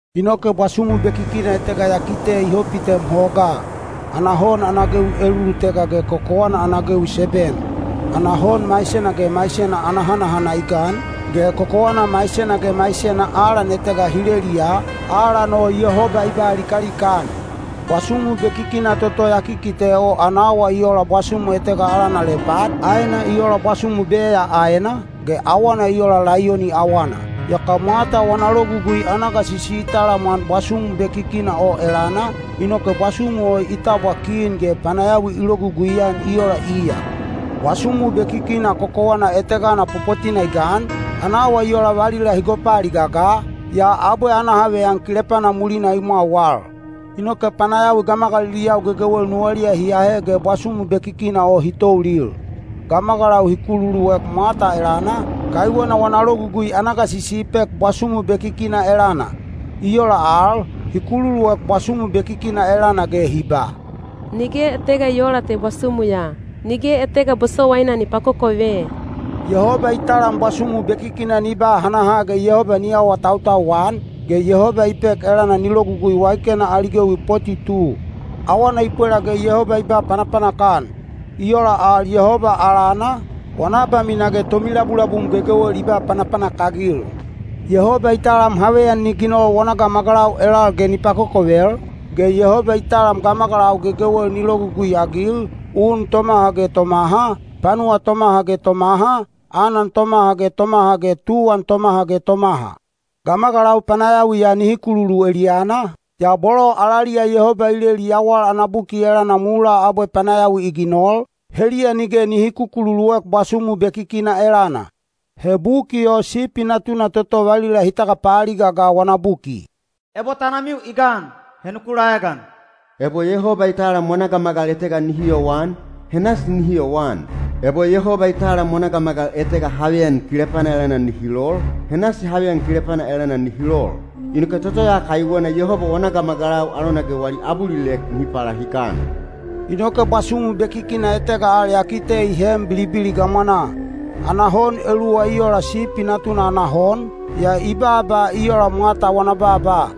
Inoke bwasumu bekikina etega ya kite i hopitem hogaa. Ana hon ana gewi elulutega ge kokowana ana gewi seben. Ana hon maisena ge maisena ana hanahana i gan, ge kokowana maisena ge maisena alan etega hi leleliya, alan o Yehoba i ba likalika-an. Bwasumu bekikina toto ya kikite o ana awa i ola bwasumu etega alana lepad, aena i ola bwasumu beya aena, ge awana i ola laiyoni awana. Yaka mwata wana logugui ana gasisi i talamwan bwasumu bekikina o elana, inoke bwasumu o i tabwa kin ge panayawi i logugui-an i ola iya. Bwasumu bekikina kokowana etegana popotina i gan, ana awa i ola valila hi gopaaliga ga, yaa abwe ana haveyan kilepana mulina i mwau al. Inoke panayawi gamagaliliyau gegewel nuwaliya hi ahe ge bwasumu bekikina o hi toulil. Gamagalau hi kululuek mwata elana, kaiwena wana logugui ana gasisi i pek bwasumu bekikina elana. I ola al, hi kululuek bwasumu bekikina elana ge hi ba, “Nige etega i oola te bwasumu ya! Nige etega bosowaina ni pakokove!” Yehoba i talam bwasumu bekikina ni ba hanaha ge Yehoba ni awatautau-an, ge Yehoba i pek elana ni logugui waikena ali gewi poti tu. Awana i pwela ge Yehoba i ba panapanak-an. I ola al Yehoba alana, wana abamina ge tomilabulabum gegewel i ba panapanak-agil. Yehoba i talam haveyan ni ginol wana gamagalau elal ge ni pakokovel, ge Yehoba i talam gamagalau gegewel ni logugui-agil, un tomaha ge tomaha, panuwa tomaha ge tomaha, anan tomaha ge tomaha ge tuwan tomaha ge tomaha. Gamagalau panayawiya nihi kululu eliyana, yaa bolo alaliya Yehoba i leli yawal ana buki elana mulaa abwe panayawi i ginol, heliya nige nihi kukululuek bwasumu bekikina elana. He buki o Sipi Natuna toto valila hi tagapaaliga ga wana buki. Ebo tanamiu i gan, he nuku laegan. Ebo Yehoba i talam wana gamagal etega nihi yowan, he nasi nihi yowan. Ebo Yehoba i talam wana gamagal etega haveyan kilepana elana nihi lol, he nasi haveyan kilepana elana nihi lol. Inoke toto ya kaiwena Yehoba wana gamagalau alona ge wali abulilek nihi palahikan. Inoke bwasumu bekikina etega al ya kite i heem bilibili gamwanaa. Ana hon eluwa i ola sipi natuna ana hon, yaa i baaba i ola mwata wana baaba.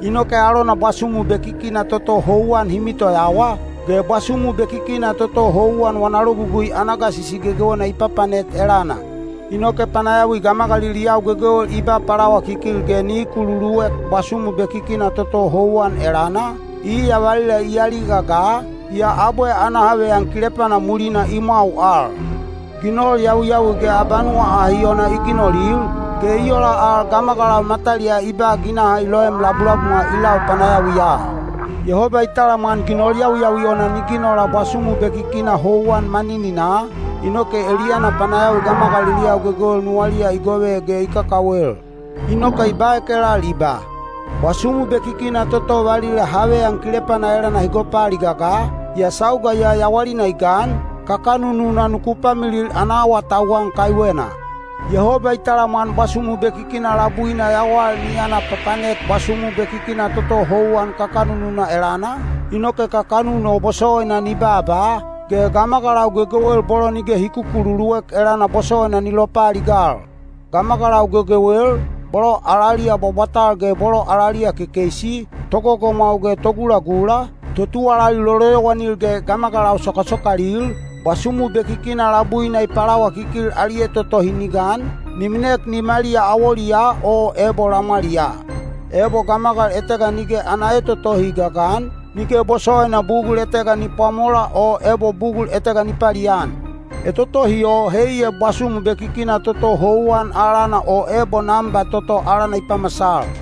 Inoke alona bwasumu bekikina toto houwan hi mitoyawa, ge bwasumu bekikina toto houwan wana logugui ana gasisi gegewena i papanet elana. Inoke panayawi gamagaliliyau gegewel i ba palawakikil ge nihi kululuek bwasumu bekikina toto houwan elana, iya valila i aliga ga, yaa abwe ana haveyan kilepana mulina i mwau al. Ginol yawiyawi ge abanuwa ahi ona i ginolil, ge i ola al gamagalau mataliyaa i ba ginaha i loem labulabumwa i lau panayawiya. Yehoba i talamwan ginol yawiyawi ona ni ginola bwasumu bekikina houwan manininaa, inoke eliyana panayawi gamagaliliyau gegewel nuwaliya i gove ge i kakawel. Inoke i baek elal i ba, “Bwasumu bekikina toto valila haveyan kilepana elana hi gopaaliga ga, yaa sauga ya yawalina i gan, kakanununa nuku pamilil ana awatauwan kaiwena.” Yehoba i talamwan bwasumu bekikina labuina yawal ni yana papanet bwasumu bekikina toto houwan kakanununa elana, inoke kakanun o bosowaina ni baaba, ge gamagalau gegewel bolo nige hi kukululuek elana bosowaina ni lopaaligal. Gamagalau gegewel, bolo alaliya bwabwatal ge bolo alaliya kekeisi, togogomwau ge togulagula, totuwalali loloyowanil ge gamagalau sokasokalil, bwasumu bekikina labuina i palawakikil ali etotohi ni gan, ni minek nimaliya awoliyaa o ebo lamwaliyaa. Ebo gamagal etega nige ana etotohi i gagan, nige bosowaina bugul etega ni pwamola o ebo bugul etega ni palian. Etotohi o heiya bwasumu bekikina toto houwan alana o ebo namba toto alana i pamasal.